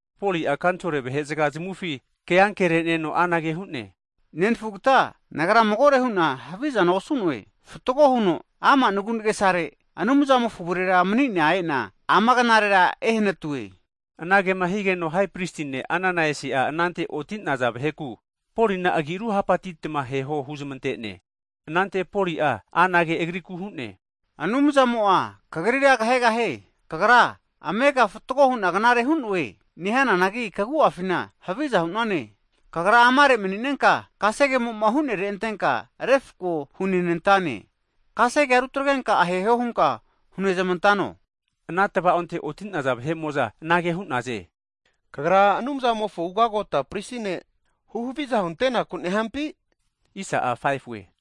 Poli'a kanisol vahe'zaga zamufi keankere'neno anage hu'ne, Nenafugate nagra magore hu'na havizana osu'noe. Fatgo huno ama' nagu'nagesare Anumzamofo avurera manina ena ama knarera ehanatue. Anagema higeno, ugagota prisi ne' Ananaisi'a anante oti'naza vaheku Polina agi ruhapatitma aheho huzmante'ne. Anante Poli'a anage agrikura hu'ne, Anumzamo'a kagrira kahegahie. Kagra amega fatgo hu'na knare hu'noe nehananagi, kagu'afinka haviza hu'nane! Kagra amare mani'nenka kasegemo'ma hu'nere antenka refako hunenantane. Kasegea rutagarenka aheho hunka hunezmantano? Ana tva'onte oti'naza vahe'mo'za anage hu'naze, kagra Anumzamofo hai prisi ne' huhaviza huntenaku nehampi? Hu'za hazageno,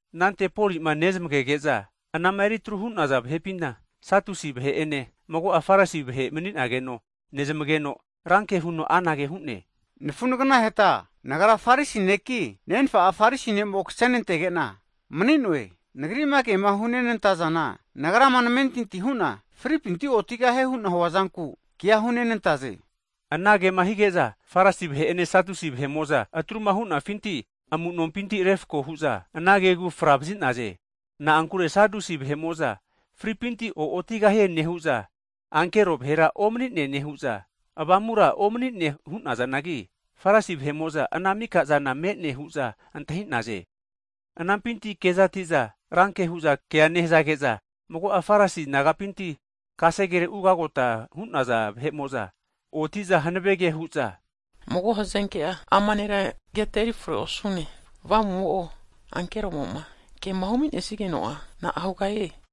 Anante Polima nezmagege'za anama eri tru hu'naza vahepina, Satusi vahe'ene mago'a Farisi vahe mani'nageno nezmageno, ranke huno anage hu'ne, nafu naganaheta nagra Farisi neki, nenfa'a Farisi ne'mo kasenantege'na mani'noe. Nagri'ma kema hunenantazana, nagrama namentinti hu'na fripinti otigahie hu'na huazanku kea hunenantaze! Anage'ma hige'za, Farisi vahe'ene Satusi vahe'mo'za atruma hu'nafinti amu'nompinti refako hu'za ana kegu fra vazi'naze. Na'ankure Satusi vahe'mo'za fripinti o'otigahie nehu'za, ankero vahera omanine nehu'za, avamura omani'ne hu'nazanagi, Farisi vahe'mo'za ana maka'zana me'ne hu'za antahi'naze. Anampinti kezati'za ranke hu'za kea nehazage'za, mago'a Farisi nagapinti kasegere ugagota hu'naza vahe'mo'za oti'za hanave ke hu'za, mago hazenke'a ama nera keta eri forera osu'none. Avamu'mo'o, ankeromo'ma kema huminesigeno'a na'a hugahie?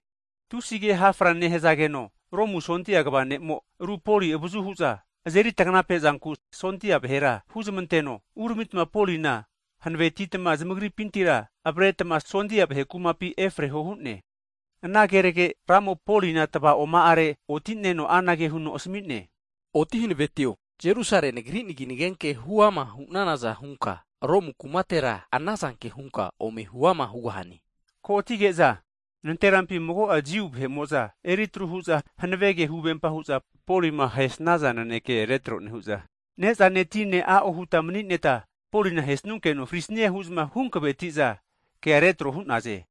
Tusi ke hafra nehazageno, Romu sondia kva ne'mo aru Poli avazu hu'za azeri taganape'zanku sondia vahera huzamanteno, uramitma Polina hanavetitma zamagripintira avaretma sondia vahe kumapi efareho hu'ne. Ana kenage Ramo Polina tava'oma'are oti'neno anage huno asami'ne, Oti hanavetio, Jerusalema Nagri nagi nagenke huama hu'nanaza hunka Romu kumatera anazanke hunka ome huama hugahane. Ko'atige'za nanterampi mago'a Jiu vahe'mo'za eri atru hu'za, hanave ke huvempa hu'za Polima ahesnaza naneke retro nehu'za, ne'zane tine a'o huta mani'neta Polina ahesunkeno frisnie, hu'za huhankaveti'za kea retro hu'naze.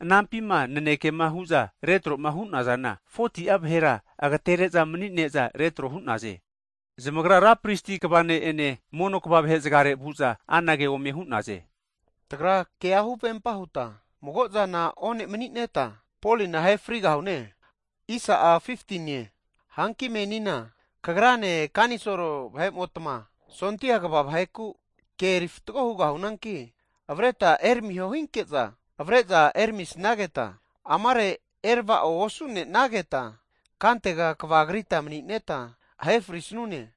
Anampima nanekema hu'za retro'ma hu'nazana 40ti'a vahera agatere'za mani'neza retro hu'naze. Zamagra ra prisi vahete'ene mono kva (elda) vahe'zgare vu'za anage ome hu'naze. Tagra kea huvempa huta mago'zana one'mani'neta, Polina ahe farigahune hu'za hu'naze. Hanki menina kagrane, kanisol vahe'motma sondia kva vaheku ke eri fatgo hugahunanki avreta eramiho hinke'za, avare'za eramisnageta, amare erava'o osu'nenageta kantega kavagrita mani'neta, ahe frisune.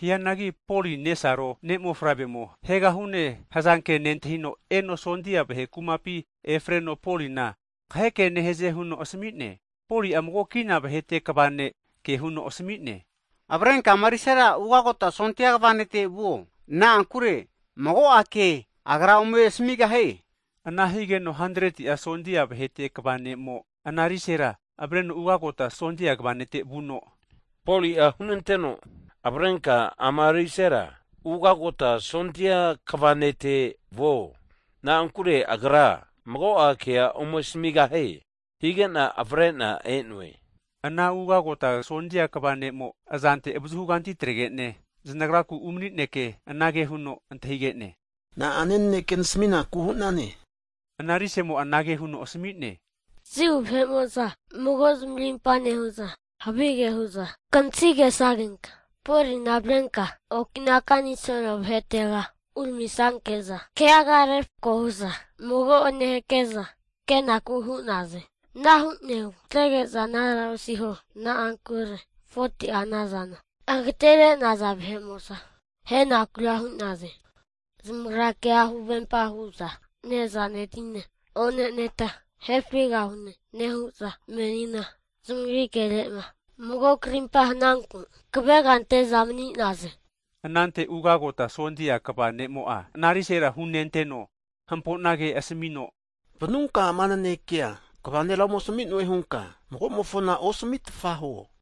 Hianagi Poli nesaro ne' mofavremo ahegahune hazanke nentahino, eno sondia vahe kumapi efareno Polina kahe ke nehaze huno asami'ne. Poli'a mago kina vahete kva ne' (sensulien), ke huno asami'ne, Avarenka ama arisera ugagota sondia kva nete vuo, na'ankure mago'a kea agra ome asamigahie huno huntene. Ana higeno hantreti'a sondia vahete kva ne'mo (sensulien,) ana arisera avareno ugagota sondia kva nete vuno, Poli'a hunanteno avarenka ama arisera ugagota sondia kva ne'te vuo, na'ankure agra mago'a kea ome asamigahie, hige'na avare'na e'noe. Ana ugagota sondia kva ne'mo azante avazuhuganti ataregene, zanagraku umani'neke, anage huno antahige'ne, Na'ane naneke nasaminaku hu'nane? Ana arise'mo'a anage huno asami'ne, Jiu vahe'mo'za mago zamarimpa nehu'za, havige hu'za kantahigesagenka Polina avarenka okina kanisol vahetega uramisanke'za, keaga refako hu'za mago'ene hake'za ke'naku hu'naze. Ana hu'negu zamatrege'za anara osiho, na'ankure 40ti'a nazana agatere'naza vahe'mo'za ahe'nakura hu'naze. Zamagra kea huvempa hu'za, ne'zane tine oneneta ahe frigahune nehu'za menina zamagri kere'ma mago karimpa hananku, kavega ante'za mani'naze. Anante ugagota sondia kva ne'mo'a ana risera hunenteno, hamponage asamino, vanunka ama nanekea kva nera ome asami'noe hunka, mago'mofona osamitfa huo.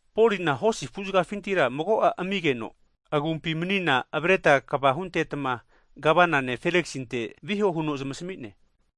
Polina hosi afu'zgafintira mago'a amigeno agumpi manina avaretma kva huntetma Gavana ne' Feliksinte viho huno zamasmi'ne.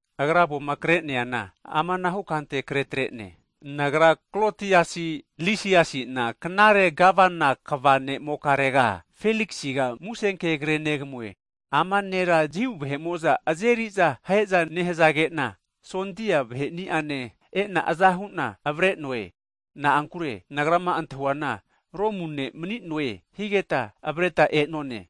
Agra avoma kre'neana amanahu kante kre tre'ne, Nagra Klotiasi Lisiasi'na, knare Gavana kva nemokarega Feliksiga musenke kre'negamue, Ama nera Jiu vahe'mo'za azeri'za ahe'za nehazage'na, sondia vahe'niane e'na aza hu'na avare'noe. Na'ankure nagrama antahuana Romu ne' mani'noe higeta avareta e'none.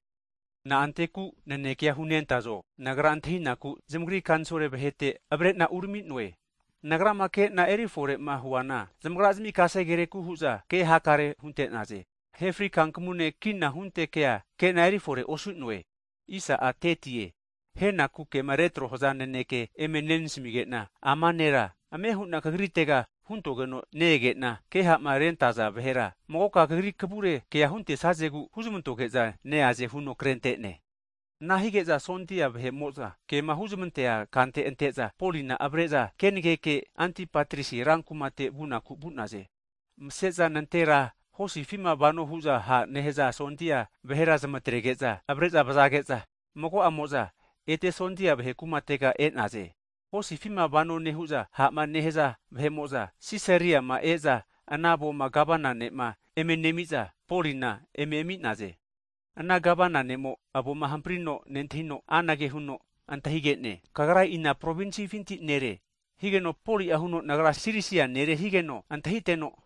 Na'anteku nanekea hunentazo nagra antahinaku, zamagri kanisol vahete avare'na urami'noe. Nagrama kena erifore'ma huana, zamagra'zimi kasegereku hu'za ke hakare hunte'naze, hianagi ahe fri kankamune kina hunte kea kena eri fore osu'noe. Ahenaku kema retro'ma haza naneke eme nenasmige'na, ama nera ame hu'na kagritega huntogeno ne-egena, ke ha'ma rentaza vahera magoka kagri kavure kea huntesazegu huzmantoge'za neaze huno krente'ne. Ana hige'za sondia vahe'mo'za kema huzmantea kante ante'za, Polina avare'za kenageke Antipatris rankumate vunaku vu'naze. Mase'za nantera hosifima vano hu'za ha' nehaza sondia vahera zamatrege'za avare'za vazage'za, mago'amo'za ete sondia vahe kumatega e'naze. Hosifima vano nehu'za ha'ma nehaza vahe'mo'za, Sisariama e'za ana avona Gavana ne'ma eme nemi'za, Polina eme ami'naze. Ana Gavana ne'mo avoma hamprino nentahino, anage huno antahige'ne, Kagra ina provinsifinti nere? Higeno Poli'a huno nagra Sirisia nere higeno antahiteno,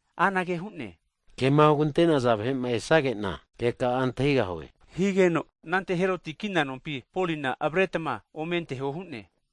anage hu'ne, kema hugante'naza vahe'ma esage'na, keka'a antahigahue. Higeno anante Heroti kina nompi Polina avaretma ome anteho hu'ne.